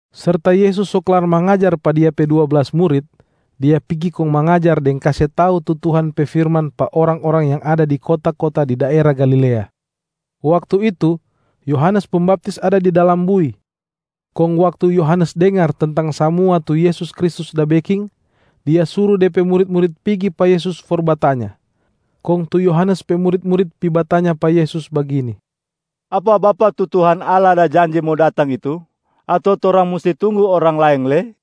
Serta Yesus so klar mangajar pa Dia pe dua blas murit, Dia pigi kong mangajar deng kase tau tu Tuhan pe firman pa orang-orang yang ada di kota-kota di daera Galilea. Waktu itu, Yohanes Pembaptis ada di dalam bui. Kong waktu Yohanes dengar tentang samua tu Yesus Kristus da beking, dia suru de pe murit-murit pigi pa Yesus for batanya. Kong tu Yohanes pe murit-murit pi batanya pa Yesus bagini, “Apa Bapak tu Tuhan Allah da janji mo datang itu? Ato torang musti tunggu orang laeng lei?”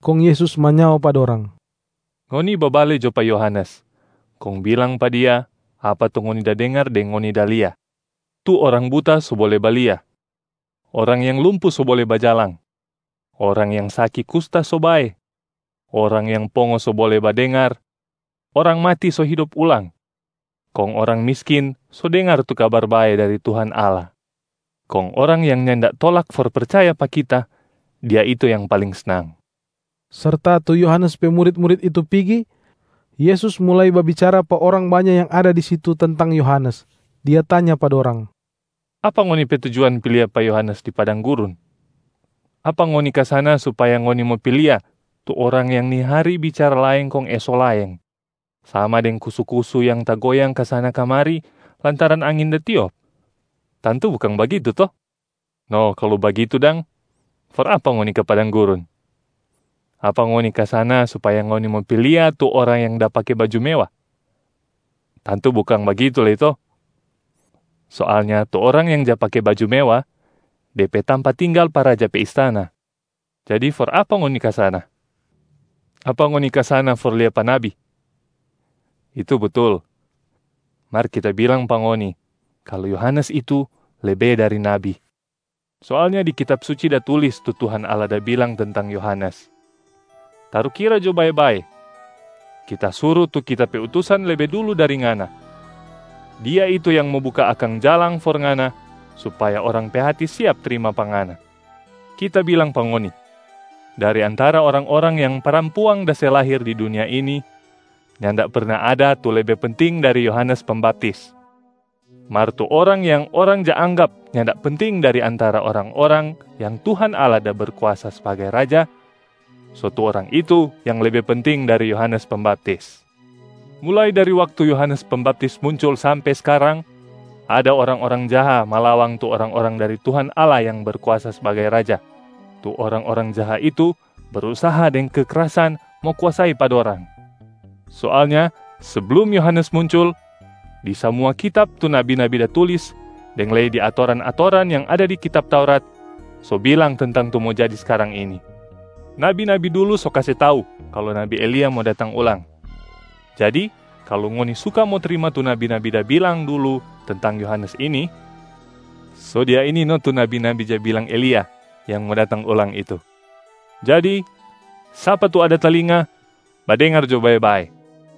Kong Yesus manyao pa dorang, “Ngoni babale jo pa Yohanes kong bilang pa dia apa tu ngoni da dengar deng ngoni da lia: tu orang buta so bole balia, orang yang lumpu so bole bajalang, orang yang saki kusta so bae, orang yang pongo so bole badengar, orang mati so hidop ulang, kong orang miskin so dengar tu Kabar Bae dari Tuhan Allah. Kong orang yang nyanda tolak for percaya pa Kita, dia itu yang paling snang.” Serta tu Yohanes pe murit-murit itu pigi, Yesus mulai babicara pa orang banya yang ada di situ tentang Yohanes. Dia tanya pa dorang, “Apa ngoni pe tujuan pi lia pa Yohanes di padang gurun? Apa ngoni ka sana supaya ngoni mo pi lia tu orang yang ni hari bicara laeng kong eso laeng, sama deng kusu-kusu yang tagoyang kasana-kamari lantaran angin da tiop? Tantu bukang bagitu to? No kalu bagitu dang, for apa ngoni ka padang gurun? Apa ngoni ka sana supaya ngoni mo pi lia tu orang yang da pake baju mewa? Tantu bukang bagitu lei to? Soalnya tu orang yang ja pake baju mewa, de pe tampa tinggal pa raja pe istana. Jadi for apa ngoni ka sana? Apa ngoni ka sana for lia pa nabi? Itu butul. Mar Kita bilang pa ngoni kalu Yohanes itu lebe dari nabi. Soalnya di Kitab Suci da tulis tu Tuhan Allah da bilang tentang Yohanes, ‘Tarukira jo bae-bae, Kita suru tu Kita pe utusan lebe dulu dari Ngana, dia itu yang mo buka akang jalang for Ngana, supaya orang pe hati siap trima pa Ngana.’ Kita bilang pa ngoni, dari antara orang-orang yang parampuang da se lahir di dunia ini, nyanda perna ada tu lebe penting dari Yohanes Pembaptis. Mar tu orang yang orang ja anggap nyanda penting dari antara orang-orang yang Tuhan Allah da Berkuasa sbagai Raja, so tu orang itu yang lebe penting dari Yohanes Pembaptis. Mulai dari waktu Yohanes Pembaptis muncul sampe skarang, ada orang-orang jaha malawang tu orang-orang dari Tuhan Allah yang Berkuasa sbagai Raja, tu orang-orang jaha itu brusaha deng kekrasan mo kuasai pa dorang. Soalnya seblum Yohanes muncul, di samua kitab tu nabi-nabi da tulis deng lei di atoran-atoran yang ada di kitab Taurat, so bilang tentang tu mo jadi skarang ini. Nabi-nabi dulu so kase tau kalu nabi Elia mo datang ulang. Jadi kalu ngoni suka mo trima tu nabi-nabi da bilang dulu tentang Yohanes ini, so dia ini no tu nabi-nabi ja bilang Elia yang mo datang ulang itu. Jadi sapa tu ada talinga, badengar jo bae-bae.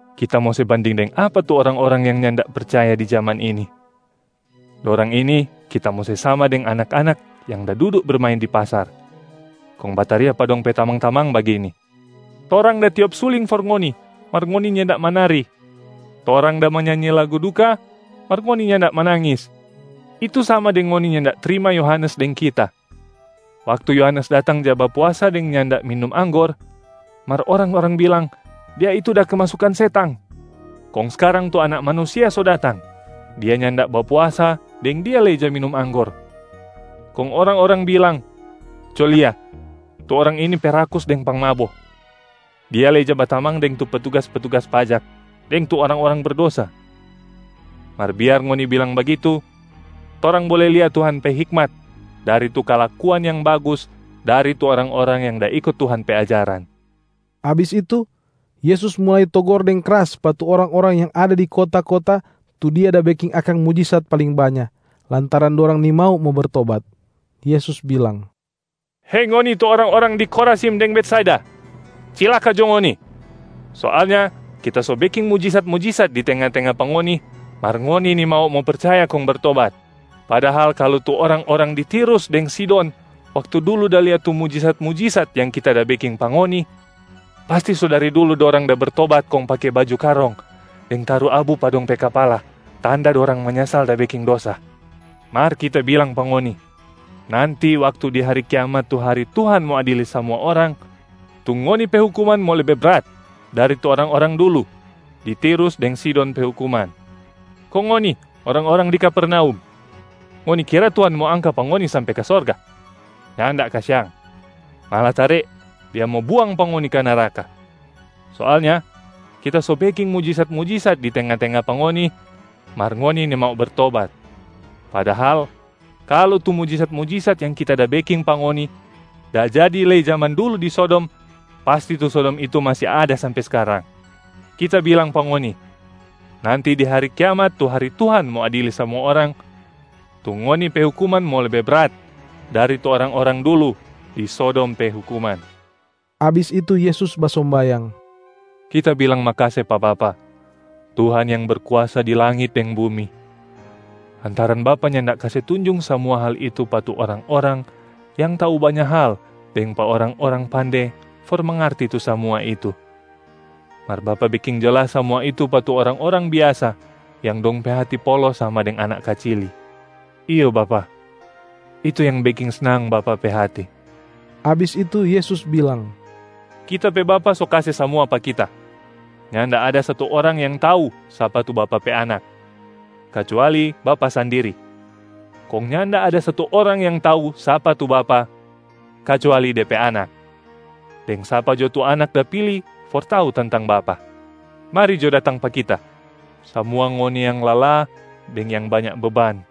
Kita mo se banding deng apa tu orang-orang yang nyanda percaya di jaman ini? Dorang ini Kita mo se sama deng anak-anak yang da dudu bermain di pasar kong bataria pa dong pe tamang-tamang bagini, ‘Torang da tiop suling for ngoni, mar ngoni nyanda manari. Torang da manyanyi lagu duka, mar ngoni nyanda manangis.’ Itu sama deng ngoni nyanda trima Yohanes deng Kita. Waktu Yohanes datang ja bapuasa deng nyanda minum anggor, mar orang-orang bilang, ‘Dia itu da kemasukan setang!’ Kong skarang tu Anak Manusia so datang. Dia nyanda bapuasa deng Dia lei ja minum anggor, kong orang-orang bilang, ‘Co lia, tu orang ini pe rakus deng pangmabo. Dia lei ja batamang deng tu petugas-petugas pajak deng tu orang-orang berdosa.’ Mar biar ngoni bilang bagitu, torang bole lia Tuhan pe hikmat dari tu kalakuan yang bagus dari tu orang-orang yang da iko Tuhan pe ajaran.” Abis itu, Yesus mulai togor deng kras pa tu orang-orang yang ada di kota-kota tu Dia da beking akang mujisat paling banya, lantaran dorang nimau mo bertobat. Yesus bilang, “Hei ngoni tu orang-orang di Khorazim deng Betsaida, cilaka jo ngoni! Soalnya Kita so beking mujisat-mujisat di tenga-tenga pa ngoni mar ngoni nimau mo percaya kong bertobat. Padahal kalu tu orang-orang di Tirus deng Sidon waktu dulu da lia tu mujisat-mujisat yang Kita da beking pa ngoni, pasti so dari dulu dorang da bertobat kong pake baju karong deng taru abu pa dong pe kapala tanda dorang manyasal da beking dosa. Mar Kita bilang pa ngoni, nanti waktu di hari kiamat tu hari Tuhan mo adili samua orang, tu ngoni pe hukuman mo lebe brat dari tu orang-orang dulu di Tirus deng Sidon pe hukuman. Kong ngoni orang-orang di Kapernaum, ngoni kira Tuhan mo angka pa ngoni sampe ka sorga? Nyanda kasiang, malatare Dia mo buang pa ngoni ka neraka. Soalnya Kita so beking mujisat-mujisat di tenga-tenga pa ngoni mar ngoni nimau bertobat. Padahal kalu tu mujisat-mujisat yang Kita da beking pa ngoni da jadi lei jaman dulu di Sodom, pasti tu Sodom itu masi ada sampe skarang. Kita bilang pa ngoni, nanti di hari kiamat tu hari Tuhan mo adili samua orang, tu ngoni pe hukuman mo lebe brat dari tu orang-orang dulu di Sodom pe hukuman.” Abis itu Yesus basombayang, “Kita bilang makase pa Bapa, Tuhan yang berkuasa di langit deng bumi, lantaran Bapa nyanda kase tunjung samua hal itu pa tu orang-orang yang tau banya hal deng pa orang-orang pande for mangarti tu samua itu. Mar Bapa beking jelas samua itu pa tu orang-orang biasa yang dong pe hati polos sama deng anak kacili. Iyo Bapa, itu yang beking snang Bapa pe hati.” Abis itu Yesus bilang, “Kita pe Bapa so kase samua pa Kita. Nyanda ada satu orang yang tau sapa tu Bapa pe Anak, kacuali Bapa sandiri. Kong nyanda ada satu orang yang tau sapa tu Bapa kacuali Dia pe Anak, deng sapa jo tu Anak da pili for tau tentang Bapa. Mari jo datang pa Kita, samua ngoni yang lala deng yang banya beban,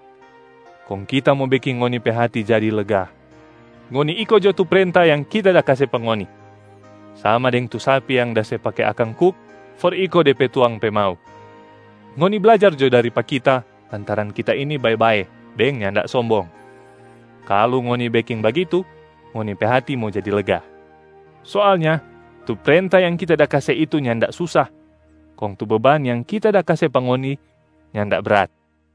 kong Kita mo beking ngoni pe hati jadi lega. Ngoni iko jo tu prenta yang Kita da kase pa ngoni, sama deng tu sapi yang da se pake akang kuk for iko de pe tuang pe mau. Ngoni blajar jo dari pa Kita lantaran Kita ini bae-bae deng nyanda sombong. Kalu ngoni beking bagitu, ngoni pe hati mo jadi lega. Soalnya tu prenta yang Kita da kase itu nyanda susa, kong tu beban yang Kita da kase pa ngoni nyanda brat.”